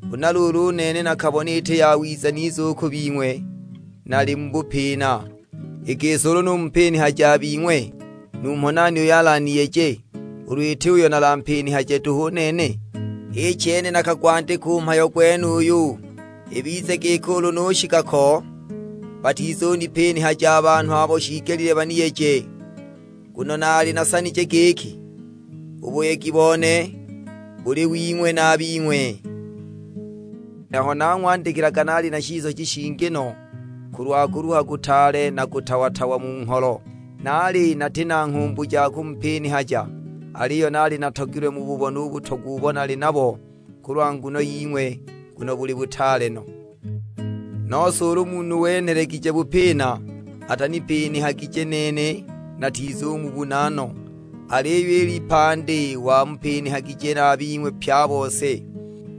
Huna luulu u nene nakabona iti yawiza nize u ku bing'we nali mu bupina. I gisi ulu numupinihaja a bing'we, numho nani uyo alaniyeje, ulu it'uyo nalampinihaje duhu u nene? H'i chene nakagwandika u mhayo gwenuyu, ibize giki ulu nushika ko, batizunipinihaja a banhu abo shiigelile baniyeje. Nguno naali nasanije giki, u buyegi bone buli wing'we na a bing'we. Aho nang'wandikilaga naali mu shisoji shingi no, kulwa kuluha kutaale na kutawa-tawa mu ngholo; naali nati na nghumbu ja kumupinihaja, aliyo naali natogilwe mububone u butogwa ubo nali nabo kulwa nguno ying'we, nguno buli butaale no! Nose ulu munhu wenhelegije bupina, atanipinihagije nene, (natizumubuna no), aliyo i lipandi wamupinihagije na a bing'we pye a bose.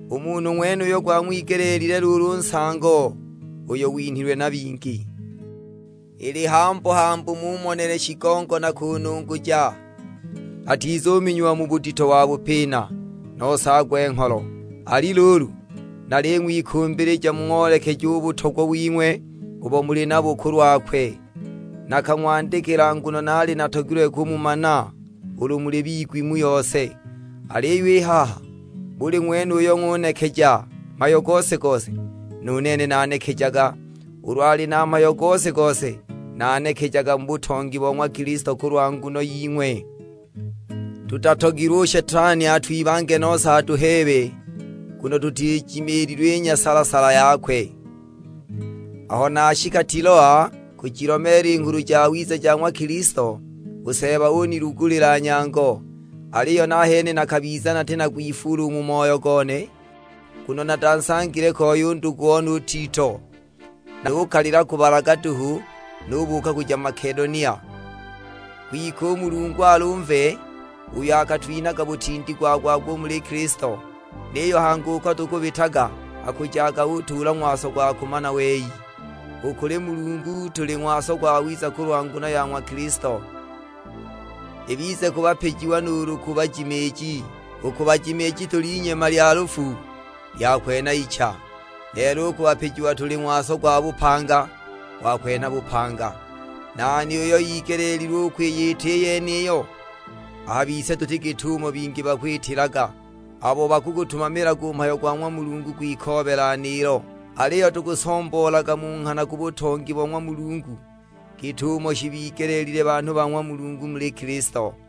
U munhu ng'wenuyo gwang'wigelile luulu u nsango uyo winhilwe na bingi. Ili hambu-hambu mumonele shigongo na kununguja, atizuminyiwa budito wa bupina, nose agwe-ngholo. Ali luulu, naling'wikumbilija mung'oolekeje u butogwa wing'we ubo muli nabo kulwakwe. Nakang'wandikila nguno naali natogilwe kumumana ulu muli bigwi mu yose. Aliyo i haha, buli ng'wene uyo ng'unekeja mhayo gose-gose, nu nene nanekejaga. Ulu ali na mhayo gose-gose, nanekejaga mu butongi bo ng'wa Kilisto kulwa nguno ying'we. Tutatogilwe u Shetani atwibange nose atuheebe, nguno tutijimiililwe i nyasala-sala yakwe! Aho nashika Tiloa kujilomeela i Nghulu Jawiza ja ng'wa Kilisto, u Seeba unilugulila nyango. Aliyo nahene nakabiza nati na kwifuula u mu moyo gone, nguno natansangile koi u ndugu one u Tito; nukalila kubalaga duhu, nubuuka kuja Makedonia. Kwike u Mulungu alumve, uyo akatwinhaga butindi gwa-gwa-gwa muli Kilisto, niyo hangi buli kwene uko tukubitaga akujaga utuula ng'waso gwa kumana wei. U kuli Mulungu tuli ng'waso gwawiza kulwa nguno ya ng'wa Kilisto, ibize ku bapijiwa nuulu ku bajimiiji. U ku bajimiiji tuli inyema lya lufu, lya kwenha icha! Lelo u ku bapijiwa tuli ng'waso gwa bupanga, gwa kwenha bupanga! Nani uyo igeleelilwe u kwiyita i yeniyo? A bise tuti git'umo bingi bakwitilaga, abo bakugutumamilaga u mhayo go ng'wa Mulungu kwikoobela niilo; aliyo tukusomboolaga mu nghana ku butongi bo ng'wa Mulungu, git'umo shibigelile banhu ba ng'wa Mulungu muli Kilisto.